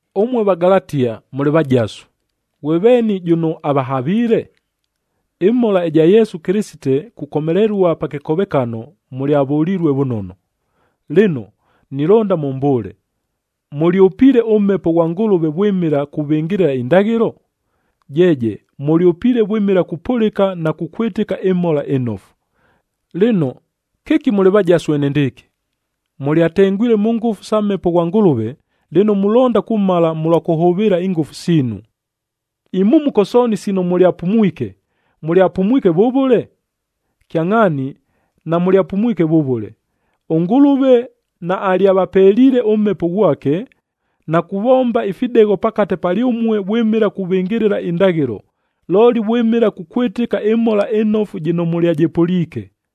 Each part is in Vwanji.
Ʉmue Vagalatia, mʉlɨ vajasu! Ghwe veeni, jʉno avahaviile? Ɨmhola ɨja Yesu Kɨlɨsite kukomelelua pa kɨkovekano, mʉlyavʉlilue vʉnono! Lɨno, nilonda mʉmbʉʉle, mʉlyʉpiile ʉMhepo ghwa Ngʉlʉve vwɨmɨla kuvɨngɨlɨla indaghɨlo? Jeeje, mʉlyʉpiile vwɨmɨla kupʉlɨka na kukwɨtɨka ɨMhola ɨNofu. Lɨno, kɨki mʉlɨ vajasu enendɨɨkɨ? Mʉlyatengwile mʉ ngʉfu sa Mhepo ghwa Ngʉlʉve, lɨno mulonda kumala mʉlwa kʉhʉvɨɨla ingʉfu siinu! Imhumuko sooni sino mʉlyapumwike, mʉlyapumwike vʉvʉle? Kyangʼhaani, namʉlyapumwike vʉvʉle. ɄNgʉlʉve naalyavapeliile ʉMhepo ghwake, na kuvomba ifidegho pakate palyʉmue vwɨmɨla kuvɨngɨlɨla indaghɨlo, looli vwɨmɨla kukwɨtɨka ɨMhola ɨNofu jɨno mʉlyajɨpʉliike.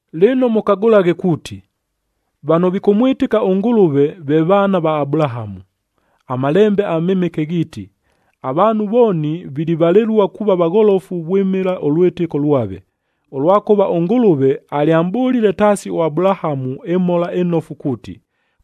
Lɨno mʉkagʉlaghe kuuti, vano vikʉmwɨtɨka ʉNgʉlʉve ve vaana va Abulahamu. AMalembe aMɨmɨke ghiiti, avaanhu vooni vilivalɨlua kuuva vagholofu vwɨmɨla ʉlwɨtɨko lwave, ʉlwakʉva ʉNgʉlʉve alyamʼbʉlile taasi ʉAbulahamu ɨMhola ɨNofu kuuti,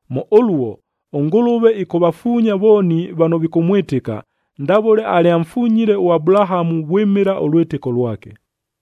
Mʉ ʉluo, ʉNgʉlʉve ɨkʉvafuunya vooni vano vikʉmwɨtɨka, ndavʉle alyamfunyile ʉAbulahamu vwɨmɨla ʉlwɨtɨko lwake.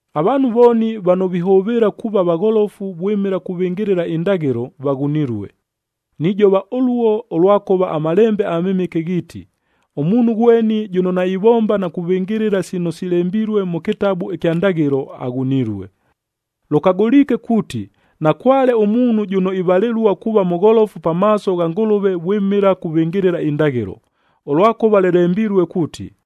Avaanhu vooni vano vihʉvɨɨla kuuva vagholofu vwɨmɨla kuvɨngɨlɨla indaghɨlo, vaghunilue. Nijova ʉluo, ʉlwakʉva aMalembe aMɨmɨke ghiiti, “Ʉmuunhu ghweni jʉno naivomba na kuvɨngɨlɨla sino silembilue mʉ kɨtabu ɨkya Ndaghɨlo, Lʉkagʉliike kuuti, nakwale ʉmuunhu jʉno ivalɨlua kuuva mʉgholofu pamaaso gha Ngʉlʉve vwɨmɨla kuvɨngɨlɨla indaghɨlo, ʉlwakʉva lɨlembilue kuuti,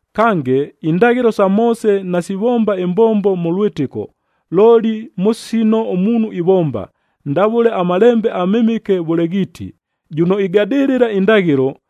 Kange, indaghɨlo sa Moose nasivomba ɨmbombo mʉ lwɨtɨko, looli mʉ sino ʉmuunhu ivomba, ndavʉle aMalembe aMɨmɨke vʉle ghiiti, “Jʉno igadɨlɨla indaghɨlo,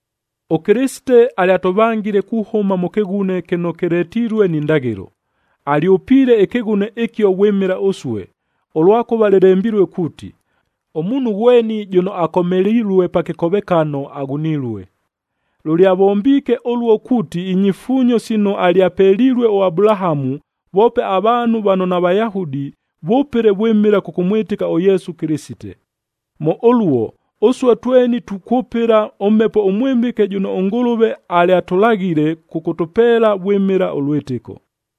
ɄKɨlɨsite alyatʉvangile kuhʉma mʉ kɨghune kɨno kɨletilue ni ndaghɨlo, alyʉpiile ɨkɨghune ɨkio vwɨmɨla ʉsue, ʉlwakʉva lɨlembilue kuuti, “Ʉmuunhu ghweni jʉno akomelilue pa kɨkovekano, Lʉlyavombiike ʉluo kuuti inyifuunyo sino alyapelilue ʉAbulahamu, voope avaanhu vano naVayahudi, vʉpɨle vwɨmɨla kʉkʉmwɨtɨka ʉYesu Kɨlɨsite. Mʉ ʉluo, ʉsue tweni tukwʉpɨla ʉMhepo ʉMwɨmɨke jʉno ʉNgʉlʉve alyatʉlaghile kʉkʉtʉpeela vwɨmɨla ʉlwɨtɨko.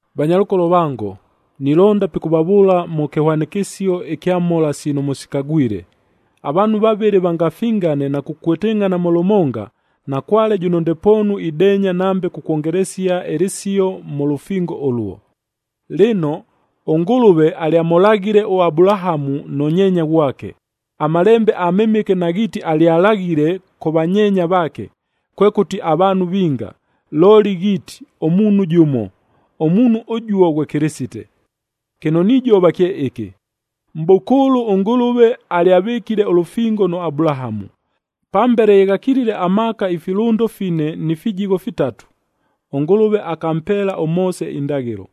Vanyalʉkolo vango, nilonda pikʉvavʉʉla mʉ kɨhwanɨkɨsio ɨkya mhola sino mʉsikagwile. Avaanhu vavɨlɨ vangafingane na kukwɨtɨngʼhana mʉ lʉmonga, nakwale jʉno ndepoonu ideenya nambe kukwongelesia ɨlɨsio mʉ lʉfingo ʉluo. Lɨno, ʉNgʉlʉve alyamʉlaghile ʉAbulahamu nʉ nyeenya ghwake. AMalembe aMɨmɨke naghiiti alyalaghile “kʉ vanyeenya vaake,” kwekʉti, “avaanhu vinga,” looli ghiiti, “Ʉmuunhu jʉmo,”h ʉmuunhu ʉjuo ghwe Kɨlɨsite. Kɨno nijova kye ɨkɨ: Mʼbʉkʉʉlʉ ʉNgʉlʉve alyavɨkile ʉlʉfingo nʉ Abulahamu. Pambele ye ghakilile amaaka ifilʉndo fine ni fijigho fitatu, ʉNgʉlʉve akampeela ʉMoose indaghɨlo.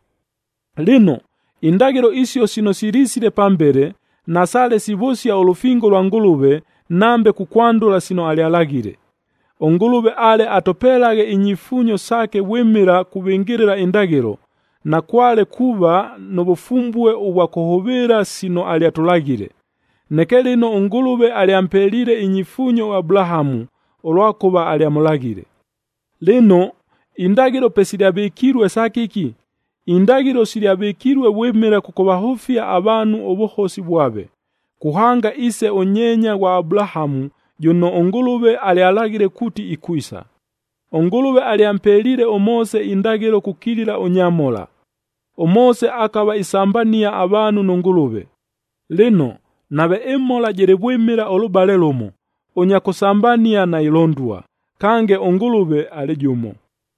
Lɨno, indaghɨlo isio sino silisile pambele nasaale sivʉsia ʉlʉfingo lwa Ngʉlʉve nambe kukwandʉla sino alyalaghile. ɄNgʉlʉve ale atʉpelaghe inyifuunyo saake vwɨmɨla kuvɨngɨlɨla indaghɨlo, nakwale kuuva nʉ vʉfumbue ʉvwa kʉhʉvɨɨla sino alyatʉlaghile. Neke lɨno ʉNgʉlʉve alyampeliile inyifuunyo ʉAbulahamu, ʉlwakʉva alyamʉlaghile. Lɨno, indaghɨlo pe silyavɨkilue sa kɨki? Indaghɨlo silyavɨkilue vwɨmɨla kʉkʉvahʉfia avaanhu ʉvʉhosi vwave, kuhanga iise ʉnyeenya ghwa Abulahamu jʉno ʉNgʉlʉve alyalaghile kuuti ikwisa. ɄNgʉlʉve alyampeliile ʉMoose indaghɨlo kukilila ʉnyamhola. ɄMoose akava isambania avaanhu nʉ Ngʉlʉve. Lɨno, nave ɨmhola jɨlɨ vwɨmɨla ʉlʉbale lʉmo, ʉnya kʉsambania nailondua, kange ʉNgʉlʉve alɨ jʉmo.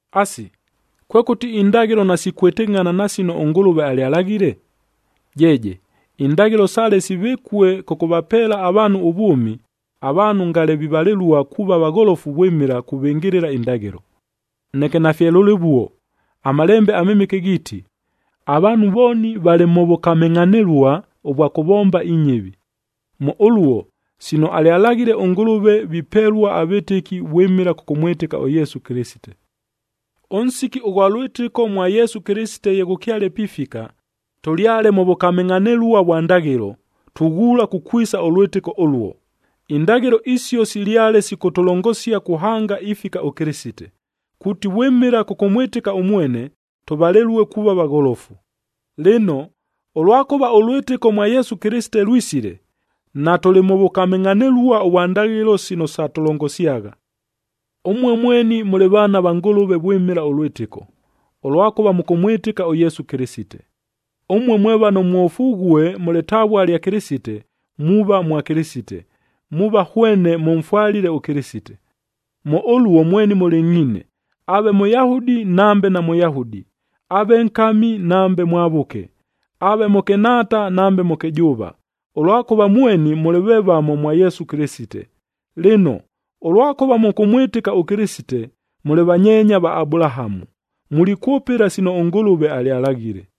Asi, kwekʉti indaghɨlo nasikwɨtɨngʼhana na sino ʉNgʉlʉve alyalaghile? Jeeje, indaghɨlo sale sivɨkue kʉkʉvapeela avaanhu ʉvwʉmi, avaanhu ngale vivalɨlua kuuva vagholofu vwɨmɨla kuvɨngɨlɨla indaghɨlo. Neke nafye lʉlɨvuo. AMalembe aMɨmɨke ghiiti, avaanhu vooni valɨ mʉ vʉkamɨngʼhanɨlua ʉvwa kʉvomba inyɨvi. Mʉ ʉluo sino alyalaghile ʉNgʉlʉvei vipelua avɨtɨki vwɨmɨla kʉkʉmwɨtɨka ʉYesu Kɨlɨsite. Ʉnsiki ʉghwa lwɨtɨko mwa Yesu Kɨlɨsite ye ghʉkyale pifika, tʉlyale mʉ vʉkamɨngʼhanɨlua vwa ndaghɨlo, tughuula kukwisa ʉlwɨtɨko ʉluo. Indaghɨlo isio silyale sikʉtʉlongosia kuhanga ifika ʉKɨlɨsite, kuuti vwɨmɨla kʉkʉmwɨtɨka ʉmwene, tʉvalɨlue kuuva vagholofu. Lɨno, ʉlwakʉva ʉlwɨtɨko mwa Yesu Kɨlɨsite lwisile, natʉlɨ mʉ vʉkamɨngʼhanɨlua ʉvwa ndaghɨlo sino satʉlongosyagha. Ʉmue mweni mʉlɨ vaana va Ngʉlʉve vwɨmɨla ʉlwɨtɨko, ʉlwakʉva mʉkʉmwɨtɨka ʉYesu Kɨlɨsite. Ʉmue mwe vano mwofughue mʉ lɨtavua lya Kɨlɨsite, muuva mwa Kɨlɨsite, muuva hwene mʉmfwalile ʉKɨlɨsite. Mʉ ʉluo mweni mʉlɨngʼhiine, aave Mʉyahudi nambe naMʉyahudi, aave nkami nambe mwavʉke, aave mʉkɨnhaata nambe mʉkɨjʉʉva, ʉlwakʉva mweni mʉlɨ vevamo mwa Yesu Kɨlɨsite. Lɨno, ʉlwakʉva mʉkʉmwɨtɨka ʉKɨlɨsite, mʉlɨ vanyeenya va Abulahamu, mulikwʉpɨla sino ʉNgʉlʉve alyalaghile.